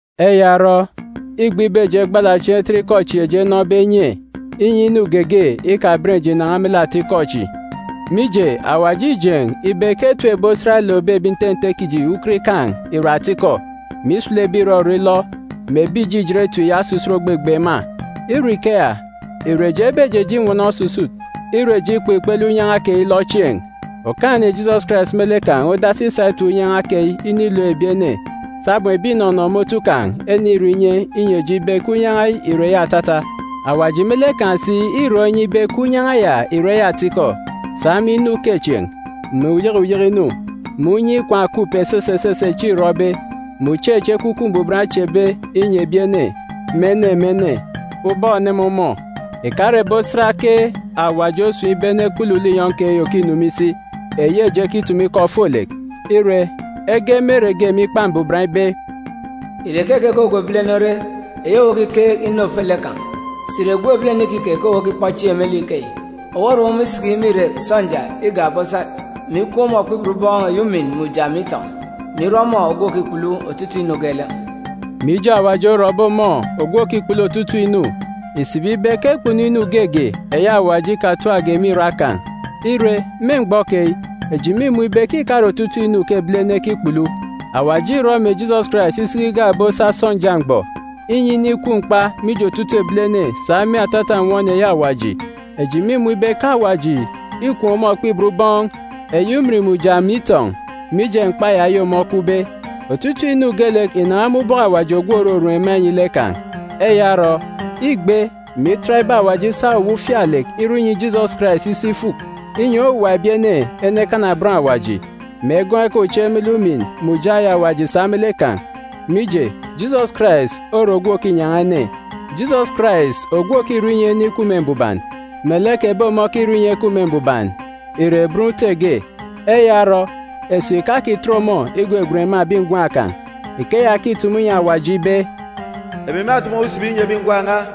Eya orọ, îgbe ibe eji egbala chieen̄ etet ikọ chi eji enọbe enye, inyi inu geege ikaben eji ìnan̄a me lek atikọ chi. Mije, Awaji îjeen̄ ibe ke etip ebi osat elookbe ebi nte nte kiji ukot ikaan̄ ìre atikọ, mè isulu ebi ìrọrọ ilọ, mè ebi ìjijit etip ya osusut ògbegbe ema. Ire ikeya, ìre eji ebejeje inwọnọ osusut, ire eji ikpọ ikpele unyan̄a keyi ilọ chieen̄? Okaan̄-ene Jisọs Karais me lek kan̄ odasi isa etip unyan̄a keyi inilook ebi ene, sabum ebi ìnọnọ me otu kan̄ enirọ inye inyi eji ibe ke unyan̄a ya ìre atata. Awaji me lek kan̄ si îrọ inye ibe ke unyan̄a ya ìre atikọ, sa me inu ukechieen̄, mè uyeke uyeke inu, mè unye ikwaan̄ òkup esese esese echi îrọbe, mè uche echi Ekwukwu Mbuban ochebe inyi ebi ene, me ene me ene, ubọk òneme ọmọ. Ìkare ebi osat ke Awaji osun̄ ibe enekpulu linyọn̄ eyi òkinu me isi, eyi eji ekitumu ikọ ofolek. Ire, ege me ere ge me Ikpa Mbuban ibe, “Ìre keke ke ogwu ebilene ore, eyi owu okikeek inu ofolek kan̄? Sà ìre gwun̄ ebilene ikike ke owu okikpọ chieen̄ me lek ikeyi? Owu orom ọmọ isiki me irek sọnja igak ebi osat, mè ikwuun̄ ọmọ okpibot ubọọn̄ eyi ujamgbugbo mè itọn̄, mè irọ ọmọ ogwu òkikpulu otutuuk inu geelek.”a Mije Awaji orọbe ọmọ ogwu òkikpulu otutuuk inu, ìsibi ibe ke kpunu inu geege eyi Awaji ikatapge me irak kan̄. Ire, me mgbọ keyi, eji mîmun̄ ibe ke ìkare otutuuk inu ke ebilene ekikpulu. Awaji îrọ mè Jisọs Karais isiki igak ebi osat sọnja mgbọ, inyi inikwu mkpa mije otutuuk ebilene sa me atata nnwọn eyi Awaji. Eji mîmun̄ ibe ke Awaji îkwuun̄ ọmọ okpibot ubọọn̄ eyi ujamgbugbo mè itọn̄, mije mkpa ya eyi ọmọ okwube. Otutuuk inu geelek ìnan̄a me ubọk Awaji ogwu òrorom ema inyi lek kan̄. Eya orọ, îgbe, mè itat ibe Awaji isa owuwa ufialek irọ inyi Jisọs Karais iso ifuk, inyi owuwa ebi ene enekana bọn Awaji, mè egọọk ekaan̄ uche me lek ujamgbugbo eyi Awaji sa me lek kan̄. Mije, Jisọs Karais ore ogwu òkinyan̄a ene. Jisọs Karais, ogwu òkirọ inyi ene ikup me mbuban, melek ebi ọmọ okirọ inyi ekup me mbuban, ìre bọn Ute ge. Eya orọ, esip ìkakitet ọmọ igwegwen ema ebi ngwan̄ kan̄. Ikeya ke îtumu inyi Awaji ibe, “Emi mâtumu owu isibi inyi ebi ngwan̄ n̄a,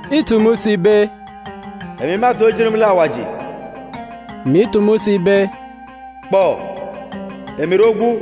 Îtumu si ibe, “Emi mâtoon̄ ejit me lek Awaji,”c mè itumu si ibe, “Kpọ, emi ire ogwu,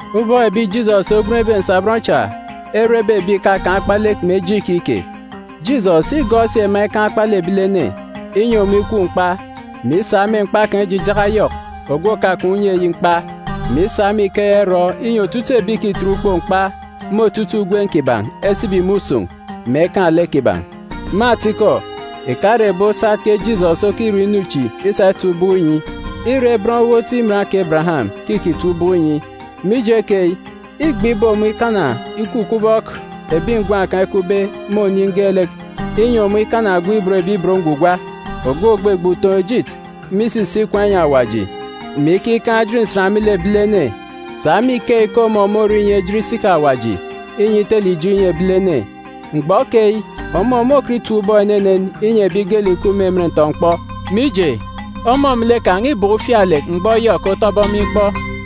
Ubọk ebi Jisọs ogwenbe nsabọn cha erebe ebi ìkakaan̄ akpalek mè eje ikike, Jisọs îgọọk si ema ikaan̄ akpalek ebilene, inyi ọmọ ikwu mkpa, mè isa me mkpa kan̄ ijijaka Yọk, ogwu òkakaan̄ unye eyi mkpa, mè isa me ikeya irọ inyi otutuuk ebi ìkitet ukpook mkpa me otutuuk ugwem kiban̄ esibi me usun̄, mè ekaan̄ lek kiban̄. Me atikọ, ìkare ebi osat ke Jisọs okirọ inu chi isa itap ubọk inyi. Îre bọn owot iman kè Ebereyam ke îkitap ubọk inyi. Mije keyi, îgbe ibe ọmọ ikana ikup ubọk ebi ngwan̄ kan̄ ekupbe me oniin̄ geelek, inyi ọmọ ikana ogwu òban Awaji, ogwu ògbegbe utoon̄-ejit me isisi ikwaan̄ inyi Awaji, mè ikikaan̄ ejit nsan me lek ebilene. Sa me ikeyi ke ọmọ môrọ esuuk me ibot ebilene mije ijo inu kiban̄. Mgbọ keyi, ọmọ môkọt itap ubọk enenen inyi ebi geelek ìkup me emen ntọ-mkpọ, mije, ọmọ me lek kan̄ îbọkọ ufialek mgbọ Yọk otọbe ọmọ ikpọ.